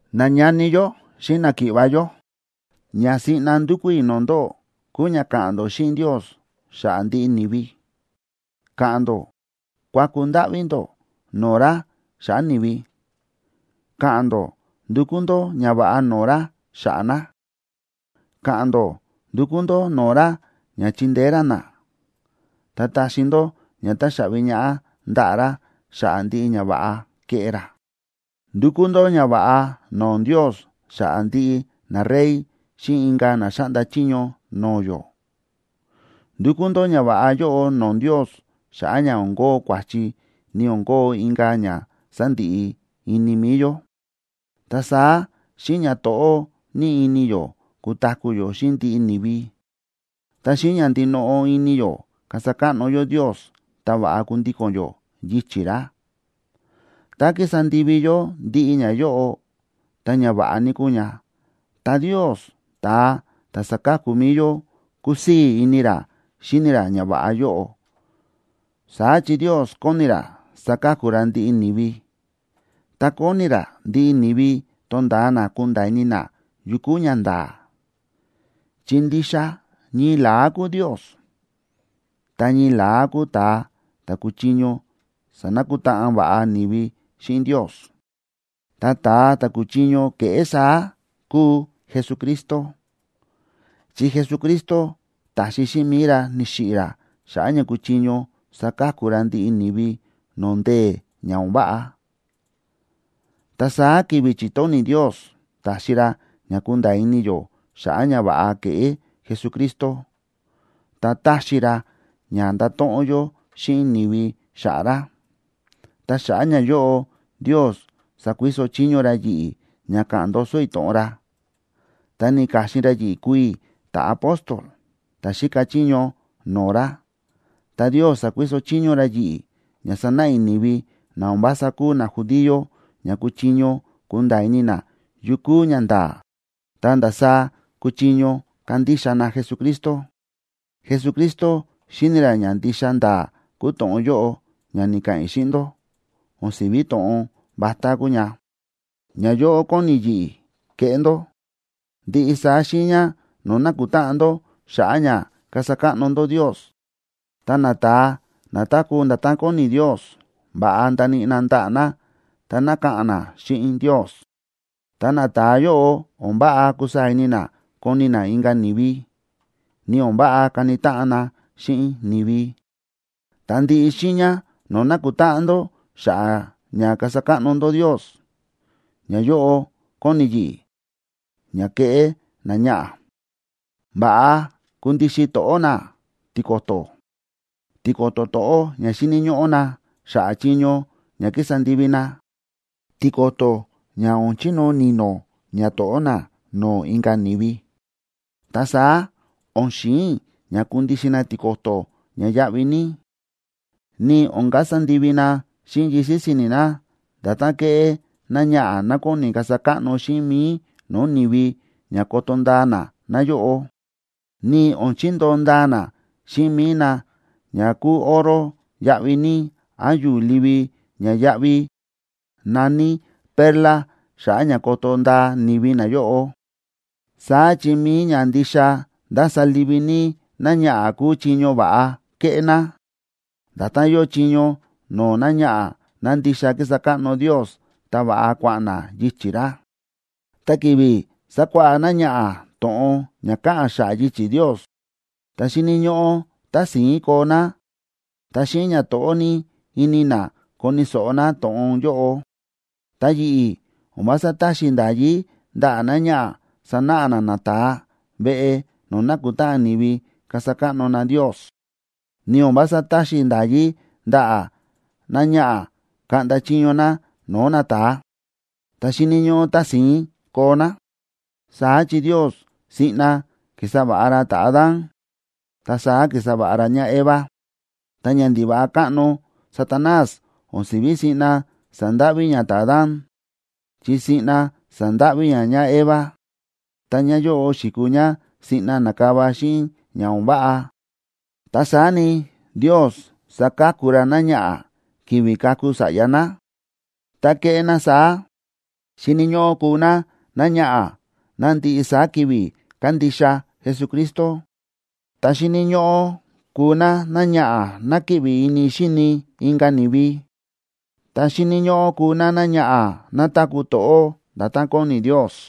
Nañani yó xíꞌin náki̱ꞌva̱ yó, ña siꞌna ndúkú i̱ no̱o̱ ndóꞌó kúu ña ka̱ꞌa̱n ndó xíꞌin Ndios xa̱ꞌa̱ ndiꞌi ni̱vi. Ka̱ꞌa̱n ndó kuaku ndáꞌví ndó no̱o̱ ra xa̱ꞌa̱ ni̱vi, ka̱ꞌa̱n ndó ndukú ndó ñava̱ꞌa no̱o̱ ra xa̱ꞌa̱ na, ka̱ꞌa̱n ndó ndukú ndó no̱o̱ ra ña chindeé ra na, ta taxi ndó ña taxaꞌvi ñaꞌá ndaꞌa̱ ra xa̱ꞌa̱ ndiꞌi ñava̱ꞌa ke̱ꞌé ra. Ndukú ndó ñava̱ꞌa no̱o̱ Ndios xa̱ꞌa̱ ndiꞌi narey xíꞌin inka̱ na xáꞌnda chiño no̱o̱ yó. Ndukú ndó ñava̱ꞌa yóꞌo no̱o̱ Ndios xa̱ꞌa̱ ña o̱n kóo kua̱chi ni o̱n kóo inka̱ ña sandiꞌi ini mi̱i yó. Ta saá xíꞌin ñato̱ꞌó ní ini yó kutaku̱ yó xíꞌin ndiꞌi ni̱vi, ta xíꞌin ña ndinoꞌo ini yó kasa káꞌno yó Ndios ta va̱ꞌa kundíko̱n yó yichi̱ ra. Tá kísa ndivi yó ndiꞌi ñayóꞌo, ta ñava̱ꞌa ní kúu ña, ta Ndios, ta̱a ta̱ sáka̱ku mi̱i yó, kúsii̱ ini ra xíni ra ñava̱ꞌa yóꞌo. Saá chi Ndios kóni ra saka̱ku ra ndiꞌi ni̱vi, ta kóni ra ndiꞌi ni̱vi tonda̱a na kunda̱a̱ ini na yu kúu ñanda̱a̱. Chi ndixa ñii la̱á kúu Ndios, ta ñii la̱á kúu ta̱a ta̱ kúchiño sanakutáꞌan va̱ꞌa ni̱vi xíꞌin Ndios. Ta ta̱a ta̱ kúchiño keꞌé saá kúu Jesucristo, chi Jesucristo ta̱xi xíꞌin mi̱i ra, ni̱xiꞌi̱ ra xa̱ꞌa̱ ña kuchiño saka̱ku ra ndiꞌi ni̱vi no̱o̱ ndee̱ ña o̱n váꞌa. Ta saá ki̱vi̱ chi̱tóni̱ Ndios, ta̱xi ra ña kúnda̱a̱ ini yó xa̱ꞌa̱ ñava̱ꞌa ke̱ꞌé Jesucristo, ta ta̱xi ra ña ndáto̱ꞌon yó xíꞌin ni̱vi xa̱ꞌa̱ ra. Ta xa̱ꞌa̱ ñayóꞌo Ndios sa̱kuiso chiño ra yi̱ꞌi̱ ña ka̱ꞌa̱n ndoso i̱ to̱ꞌon ra, ta ni̱ka̱xin ra yi̱ꞌi̱ kuu i̱ ta̱apóstol ta̱ xíka chiño no̱o̱ ra. Ta Ndios sa̱kuiso chiño ra yi̱ꞌi̱ ña sanáꞌa i̱ ni̱vi na o̱n vása kúu najudío ña kúchiño kunda̱a̱ ini na yu kúu ñanda̱a̱ ta ndasaá kúchiño kandixa na Jesucristo. Jesucristo xíni̱ ra ña ndixa nda̱a̱ kúu to̱ꞌon yóꞌo ña ni̱ka̱ꞌa̱n i̱ xíꞌin ndó, o̱n si̱ví to̱ꞌon vatá kúu ña. Ñayóꞌo kóni yi̱ꞌi̱ keꞌé ndó: Ndiꞌi saá xiiña no̱o̱ nákutáꞌan ndó xa̱ꞌa̱ ña kasa káꞌno ndó Ndios, ta nata̱a na táku̱ nda̱tán kóni Ndios, va̱ꞌa ndaníꞌi na ndaꞌa̱ na ta ka̱ꞌa̱n na xíꞌin Ndios. Ta nata̱a yóꞌo o̱n váꞌa kusaa̱ ini na koni na inka̱ ni̱vi, ni o̱n váꞌa kani táꞌan na xíꞌin ni̱vi. Ta ndiꞌi xiiña no̱o̱ nákutáꞌan ndó xa̱ꞌa̱ ña kasa káꞌno ndó Ndios, ñayóꞌo kóni yi̱ꞌi̱ ña keꞌé náñaꞌa̱: Va̱ꞌa kundixin to̱ꞌó ná tiko̱to̱, tiko̱to̱ to̱ꞌó ña xíni̱ ñóꞌó ná xa̱ꞌa̱ chiño ña kísa ndivi ná, tiko̱to̱ ña o̱n chinóo ni̱no̱ ñato̱ꞌó ná no̱o̱ inka̱ ni̱vi. Ta saá o̱n xi̱in i̱ ña kundixin ná tiko̱to̱ ña yáꞌví ní, ni o̱n kasa ndivi ná xíꞌin yisi̱ si̱ni̱ ná nda̱tán kéꞌé náñaꞌa̱ ná kóni kasa káꞌno xíꞌin mi̱i no̱o̱ ni̱vi ña koto ndaa na náyóꞌo, ni o̱n chindoo ndaa ná xíꞌin mi̱i ná ña kúu oro yáꞌví ní án yu̱u̱ livi ña yáꞌví na̱ní perla xa̱ꞌa̱ ña koto ndaa ni̱vi náyóꞌo. Saá chi mi̱i ña ndixa ndása livi ní náñaꞌa̱ kúu chiño va̱ꞌa kéꞌé ná, nda̱tán yóo chiño no̱o̱ náñaꞌa̱ ná ndixa kísa káꞌno Ndios ta va̱ꞌa kua̱ꞌa̱n ná yichi̱ ra. Ta ki̱vi̱ sákuáꞌá náñaꞌa̱ to̱ꞌon ña káꞌa̱n xa̱ꞌa̱ yichi̱ Ndios, ta xíni̱ ñóꞌó tási̱ín koo ná ta xíꞌin ñato̱ꞌó ní ini ná koni̱ so̱ꞌo ná to̱ꞌon yóꞌo. Ta yi̱ꞌi̱, o̱n vása táxi i̱ nda̱yí ndaꞌa̱ náñaꞌa̱ sanáꞌa ná nata̱a veꞌe no̱o̱ nákutáꞌan ni̱vi kasa káꞌno na Ndios, ni o̱n vása táxi i̱ nda̱yí ndaꞌa̱ náñaꞌa̱ kaꞌnda chiño ná no̱o̱ nata̱a, ta xíni̱ ñóꞌó tási̱ín koo ná. Saá chi Ndios siꞌna ki̱sa va̱ꞌa ra ta̱Adán, ta saá ki̱sa va̱ꞌa ra ñáEva. Ta ñandiva̱ꞌa káꞌno Satanás o̱n si̱ví siꞌna sa̱ndáꞌví ña ta̱Adán, chi siꞌna sa̱ndáꞌví ña ñáEva. Ta ñáyóꞌo xi̱kuu ñá siꞌna na̱kava xíꞌin ña o̱n váꞌa. Ta saá ni, Ndios saka̱ku ra náñaꞌa̱ ki̱vi̱ kaku sa̱ꞌya ná, tá keꞌé ná saá: Xíni̱ ñóꞌó kuu ná náñaꞌa̱ ná ndiꞌi saá ki̱vi̱ kándixa Jesucristo, ta xíni̱ ñóꞌó kuu ná náñaꞌa̱ ná kíꞌvi ini xíni ná inka̱ ni̱vi, ta xíni̱ ñóꞌó kuu ná náñaꞌa̱ ná táku̱ to̱ꞌó nda̱tán kóni Ndios.